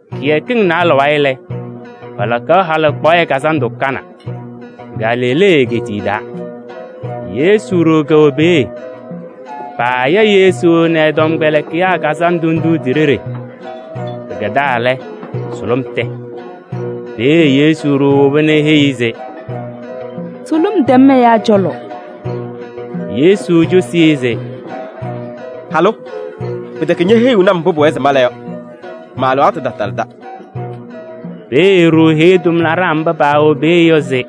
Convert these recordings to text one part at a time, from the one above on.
Kɩyakɩŋ naalɛ wayɩ lɛ, palakaɣ halɩkpaɣyɛ kazandʋ Kana, Galilee egeetiye taa. Yesu ɖoo kɛwɛ peeye. Paaya Yesu nɛ ɛ-tɔmkpɛlɩkɩyaa kazandʋ ndʋ ti-ɖeɖe. Pɩkɛdaa lɛ, sʋlʋm tɛ. Peeye Yesu ɖoo woba nɛ eheyi-i se: “Sʋlʋm tɛm ɛyaa cɔlɔ.” Yesu cosi-i se: “Halʋ! Pɩtɛkɛ ñeheyiɣni-m mbʋ pʋwɛɛ se mala yɔ. Ma-alɩwaatʋ tatalɩda.” Peeye e-ɖoo heyi tʋmlaɖaa mba pɛwɛ peeye yɔ se: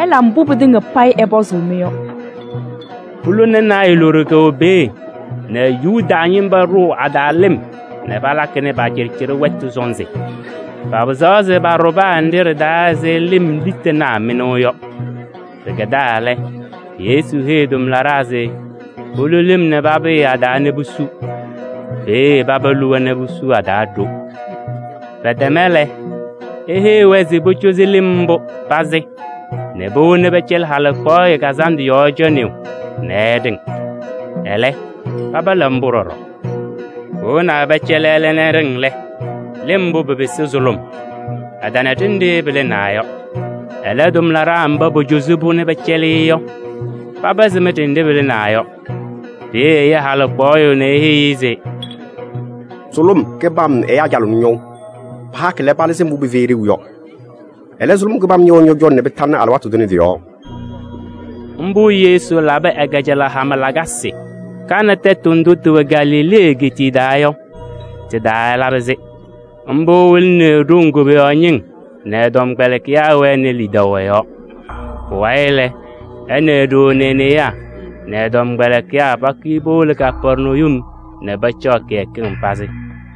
“Ɩla mbʋ pɩtɩŋa payɩ ɛpɔzʋʋ-mɩ yɔ.” Pulona naayɛ loɖo kɛwɛ peeye nɛ Yuda ñɩma ɖʋʋ a-taa lɩm nɛ palakɩnɩ pa-cɩɖɩcɩɖɩ wɛtʋ sɔnzɩ. Papɩzaɣ se paɖʋ paa nɖɩ ɖɩ-taa ɛzɩ lɩm litanaa mɩnʋʋ yɔ. Pɩkɛdaa lɛ, Yesu heyi tʋmlaɖaa se polu lɩm nɛ papɩyɩ a-taa nɛ pusu. Peeye paba luwa nɛ pusu a-taa ɖo. Pɛtɛma lɛ, eheyi-wɛ se pocozi lɩm mbʋ pazɩ nɛ powoni pɛcɛlɩ halɩkpaɣyɛ kazandʋ yɔɔ cɔnɩyʋ nɛ ɛɖɩŋ. Ɛlɛ pala mbʋ ɖɔɖɔ. Powonaa pɛcɛlɩ ɛlɛ nɛ ɛɖɩŋ lɛ, lɩm mbʋ pɩpɩsɩ sʋlʋm. Ɛtana ɖenɖe pɩlɩnaa yɔ. Ɛlɛ, tʋmlaɖaa mba pocozi-pʋ nɛ pɛcɛlɩ-ɩ yɔ, paba sɩm ɖenɖe pɩlɩnaa yɔ. Peeye ɛya halɩkpaɣyʋ nɛ eheyi-i se: “Sʋlʋm kɩbam ɛyaa calɩɣnɩ ñɔʋ. Pahakɩ lɛ, palɩzɩ mbʋ pɩfɛyɩ ɖeu yɔ. Ɛlɛ, sʋlʋm kɩbam ñɛwɛɛ ñɔ-cɔlɔ nɛ pɩtalɩ alɩwaatʋ tʋnɛ tɩ-yɔɔ!” Mbʋ Yesu labɩ ɛ-kajalaɣ hama lakasɩ. Kana tɛtʋ ndʋ tɩwɛ Galilee egeetiye taa yɔ, tɩ-taa ɛlabɩ-sɩ. Mbʋ ɛwɩlɩnɩ e-ɖoŋ koboyaɣ ñɩŋ nɛ ɛ-tɔmkpɛlɩkɩyaa wɛnɩ lidaʋ ɛ-yɔɔ. Pʋwayɩ lɛ, ɛ nɛ e-ɖoo nɛ e-newaa nɛ ɛ-tɔmkpɛlɩkɩyaa pakʋyɩ powolo Kapɛrnayum nɛ pacaɣ kɩyakɩŋ pazɩ.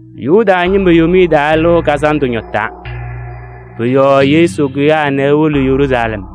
Yuda ñɩma Yomiye Taa Lɩʋ Kazandʋ ñɔtaa. Pʋ-yɔɔ Yesu kʋyaa nɛ ewolo Yeruusalɛm.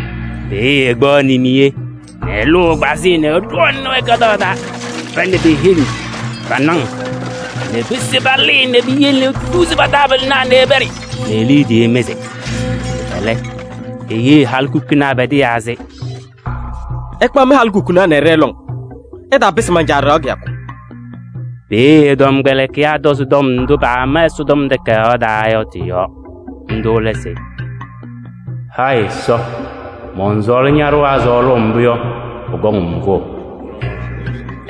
Peeye ɛkpaɣ nimee nɛ ɛlʋʋ ɛgbazɩyɛ nɛ ɛɖɔɔnɩnɩ-wɛ ka-taa, pa nɛ pe-heŋ nɛ pa-naŋ nɛ pese palɩɩ nɛ piyele etuzi pa-taabɩlɩnaa ɛpɛɖɩ nɛ liidiye mɩzɩ. Ɛlɛ, eheyi halikukunaa pɛdɩyaa se: “Ɩkpaɣ mɩ-halikukunaa nɛ ɩɖɛɛ lɔŋ. Ɩtaapɩsɩ man-Caa ɖɩɣa kɩyakʋ.” Peeye ɛ-tɔmkpɛlɩkɩyaa tɔzɩ tɔm ndʋ pama Ɛsɔtɔm Takayaɣ taa yɔ tɩ-yɔɔ. Ndʋ lɛ se: “Hayɩ Ɛsɔ, mɔnsɔɔlɩ ña-ɖɩɣa sɔɔlʋʋ mbʋ yɔ, pʋkɔŋ-m kʋʋ.”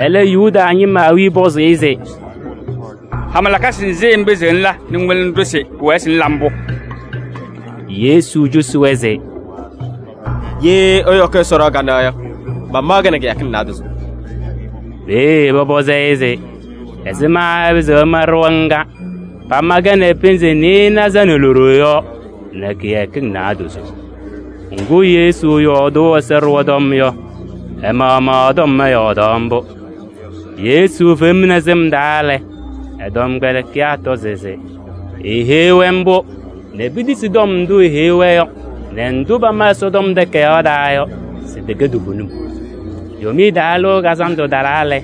Ɛlɛ, Yuda ñɩma awiya pɔzɩ-ɩ se: “Hama lakasɩ nzɩ ŋpɩzɩɣ ŋla nɛ ŋwɩlɩnɩ-ɖʋ se pʋwɛɛ se ŋla mbʋ?” Yesu cosi-wɛ se: “Ye ɩyɔkɩ Ɛsɔ ɖɩɣa kanɛ yɔ, mamaɣ-kɛ nɛ kɩyakɩŋ naadozo.” Peeye pɔpɔzɩ-ɩ se ɛzɩma ɛpɩzɩɣ ɛma ɖɩɣa ŋga pama-kɛ nɛ pɩnzɩ nɩɩnaza nɛ loɖo yɔ nɛ kɩyakɩŋ naadozo? Ŋgʋ, Yesu yɔɔdʋʋ Ɛsɔ ɖɩɣa tɔm yɔ, ɛ-maɣmaɣ ɛ-tɔm ɛyɔɔdaɣ mbʋ. Yesu femni sɩm taa lɛ, ɛ-tɔmkpɛlɩkɩyaa tɔzɩ se eeheyi-wɛ mbʋ nɛ petisi tɔm ndʋ eheyi-wɛ yɔ nɛ ndʋ pama Ɛsɔtɔm Takayaɣ taa yɔ se tɩkɛ toovenim. Yomiye Taa Lɩʋ Kazandʋ talaa lɛ,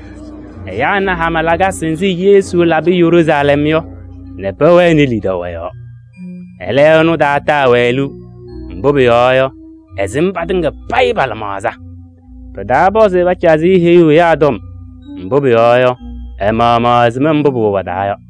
ɛyaa na hama lakasɩ nzɩ Yesu labɩ Yeruusalɛm yɔ nɛ pɛwɛnɩ lidaʋ ɛ-yɔɔ. Ɛlɛ, ɛnʋ tataa-wɛ liu, mbʋ pʋyɔɔ yɔ, ɛsɩm patɩŋa payɩ pa-lɩmaɣza. Pɩtaapɔzɩ se pacazɩ-ɩ heyuu ɛyaa tɔm. Mbʋ pʋyɔɔ yɔ, ɛ-maɣmaɣ ɛsɩm mbʋ pʋwɛ pa-taa yɔ.